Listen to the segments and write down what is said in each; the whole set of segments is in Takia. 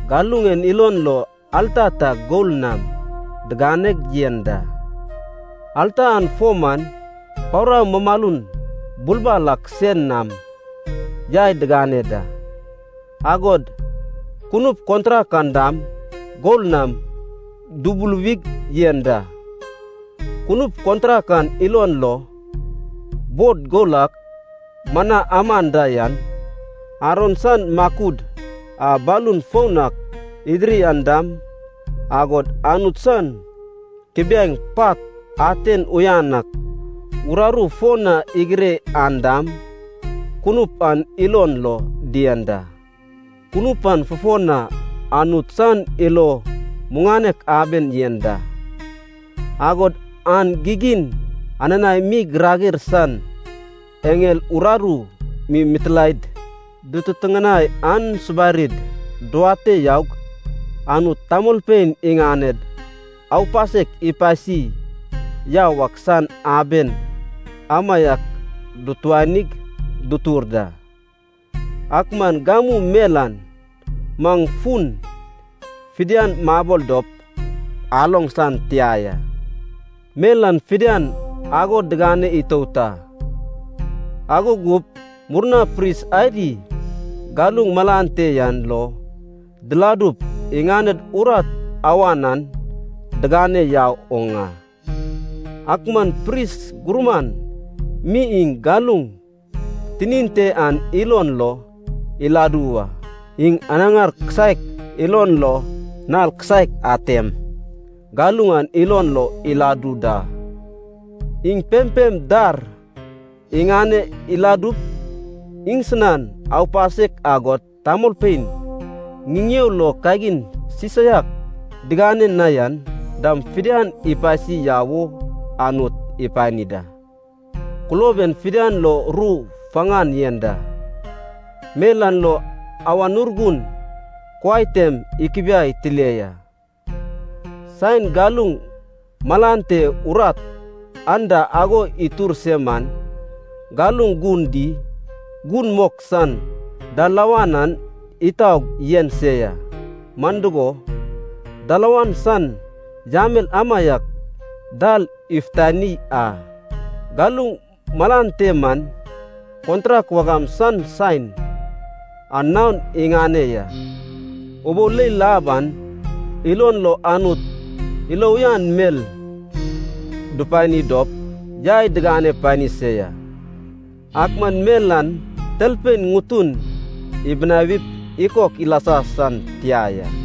Galuŋ en ilon lo alta ta gol nam diganeg yen da. Alta an fo man pawra mumalun bulbal ak sen nam yai digane da. Agod kunup kontrak an dam gol nam dubuluwig yen da. Kunup kontrak an ilon lo, bod gol a mana aman da yan, Aron san makud a balun foun ak idiri an dam, agod Anut san kubiaeŋ pat aten uyan ak uraru fo na igire an dam, kunup an ilon lo dien da. Kunup an fufo na Anut san ilo muŋanek aben yen da, agod an gigin ananaem mi Girager san eŋel uraru mi mitilaed dututuŋanai an subarid duwate yaug Anut tamolpein iŋaned aupasek ipasi yau ak san aben amaiak dutuanig dutur da. Ak man gamu mel an maŋ fun fidian mabol dop aloŋ san tia ya. Mel an fidian ago digane itout a, ago gup murna pris adi galuŋ malan te yan lo diladup iŋaned urat awan an digane yau oŋ a. Ak man pris gurman mi iŋ galuŋ tinin te an ilon lo iladu wa. Iŋ anaŋar kisaek ilon lo nal kisaek atem galuŋ an ilon lo iladu da. Iŋ pempem dar iŋane iladup iŋsinan aupasek agod tamolpein ŋiŋeo lo kagin sisaiak digane na yan, dam fidian ipasi yau wo Anut ipani da. Kulob en fidian lo ru faŋan yen da. Mel an lo Awan Urgun kuai tem ikubiai tile ya, saen galuŋ malan te urat anda ago itur se man, galuŋ Gun di, Gun Mok san dalawan an itaug yen se ya. Man dugo, dalawan san yamel amaiak dal ifutani a. Galuŋ malan te man kontrak wagam san saen, an naon iŋane ya. Ubou leil ab an ilon lo Anut ilo uyan mel dupani dop yai digane pani se ya, ak man mel an talpein ŋutun ibinawip ikok ilasa san tia ya.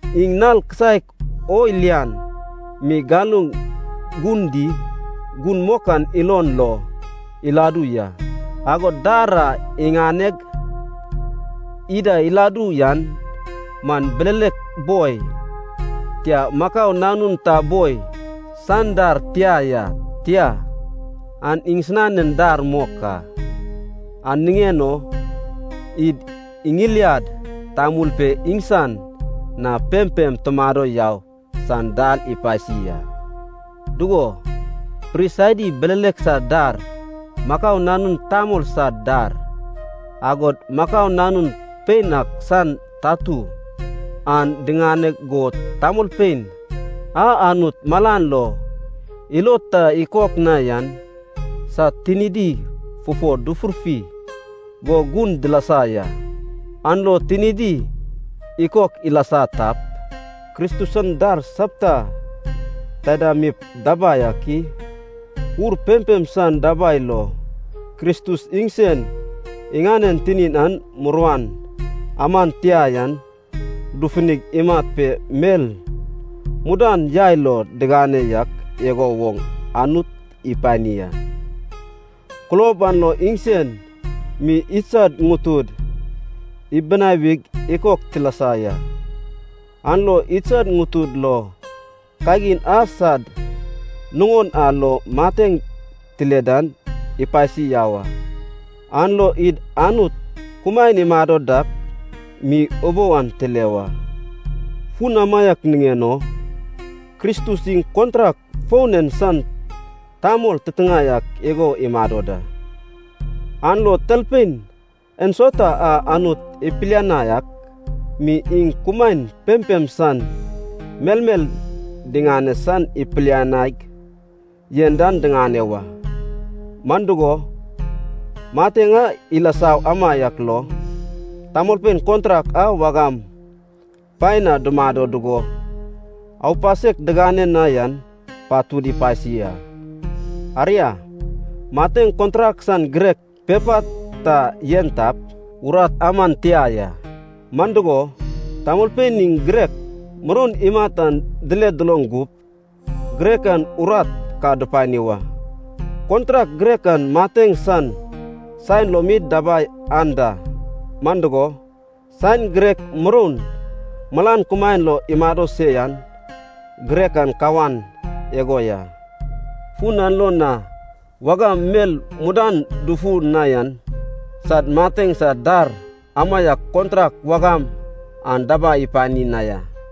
Iŋ nal kisaek o lian mi galuŋ Gun Di, Gun Mok an ilon lo iladu ya, agod dar a iŋaneg ida iladu yan man bilelek boi, tia makau nanun ta boi san dar tia ya, tia, an iŋsinanen dar mok a. An niŋen o id iŋiliad tamul pe iŋsan na pempem tumado yau san dal ipasi a. Dugo, pris adi bilelek sad dar, makau nanun tamol sad dar, agod makau nanun pein ak san tatu, an diŋane go tamolpein a, Anut malan lo ilod ta ikok na yan, sad tinidi fufo dufurfi go gun dilasa ya, an lo tinidi ikok ilasa tap, Kristus san dar sapta taida mip dabai ak i? Ur pempem san dabai lo, Kristus iŋsen iŋanen tinin a muruan aman tia yan dufuni imat pe mel mudan yai lo digane yak igo woŋ Anut ipani a. Kulob an lo iŋsen mi idsad ŋutud ibinawig ikok tilasa ya, an lo idsad ŋutud lo kagin a sad nuŋon a lo mateŋ tile dan ipasi yau a, an lo id Anut kumaen imado dak mi ubou an tile wa. Fun amaiak niŋen o Kristus iŋ kontrak foun en san tamol titiŋae ak igo imado da. An lo talpein ensauta a Anut ipilianai ak mi, iŋ kumaen pempem san melmel diŋane san ipilianaig yen dan diŋane wa. Man dugo, mateŋ a ilasa amaiak lo, tamolpein kontrak a wagam paen na dumado dugo aupasek digane na yan patud ipasi a. Aria, mateŋ kontrak san girek (pepa) ta yen tap, an man urat aman tia ya. Man dugo, tamolpein iŋ girek muroun imat an dile duloŋ gup, girek an urat ka dupani wa. Kontrak girek an mateŋ san saen lo mi dabai anda. Man dugo, saen girek muroun malan kumaen lo imado se yan, girek an kawan igo ya. Fun an lo na wagam mel mudan dufu na yan sad mateŋ san dar amaiak kontrak wagam an dabai ipani na ya.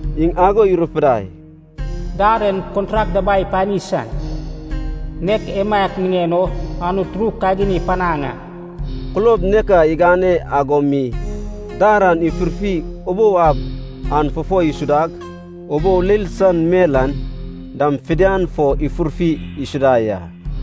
Iŋ ago irupidai, “Dar en kontrak dabai ipani san, nek emaiak niŋen o Anut ru kagin ipanaŋ a.” Kulob nek a igane ago mi dar an ifurfi ubou ab an fo isudag, ubou leil san mel an dam fidian fo ifurfi isuda ya.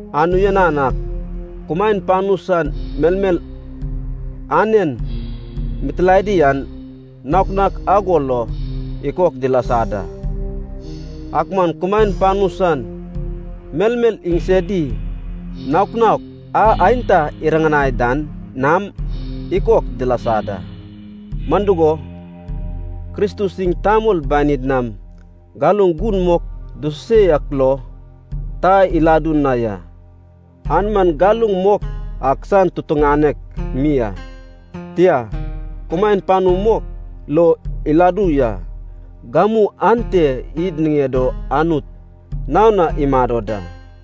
An uyan ak kumaen panu san melmel anen mitilaedi an naok naok ago lo ikok dilasa da. Ak man kumaen panu san melmel iŋsedi, naok naok a aenta iriŋanai dan nam ikok dilasa da. Man dugo, Kristus iŋ tamol banid nam galuŋ gun mok dususe yak lo ta iladu na ya. An man galuŋ mok ak san tutuŋanek mi a. Tia, kumaen panu mok lo iladu ya. Gamu ante id niŋed o Anut naon na imado da.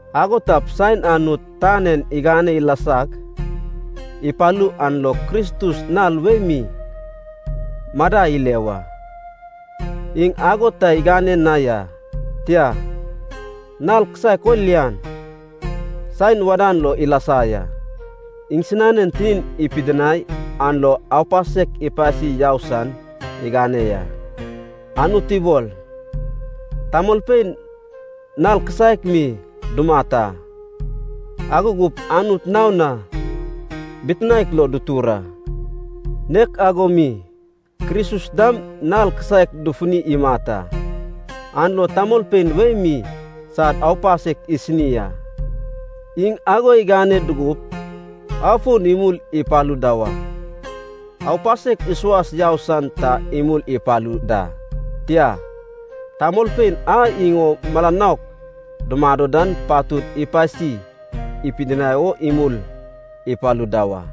Ago tap, saen Anut tan en igane ilasag ipalu an lo Kristus nal wei mi madai ile wa. Iŋ ago ta igane na ya, tia, nal kisaek o lian saen wadan lo ilasa ya. Iŋsinanen tinin ipidinai an lo aupasek ipasi yau san igane ya. Anut ibol, tamolpein nal kisaek mi dumat a, ago gup Anut naon na bitinaek lo dutur a. Nek ago mi, Kristus dam nal kisaek dufuni imat a, an lo tamolpein wei mi sad aupasek isini a. Iŋ ago igane dugup afon imul ipalu da wa. Aupasek isuas yau san ta imul ipalu da, tia, tamolpein a iŋ o mala nouk dumado dan patud ipasi ipidinai o imul ipalu da wa.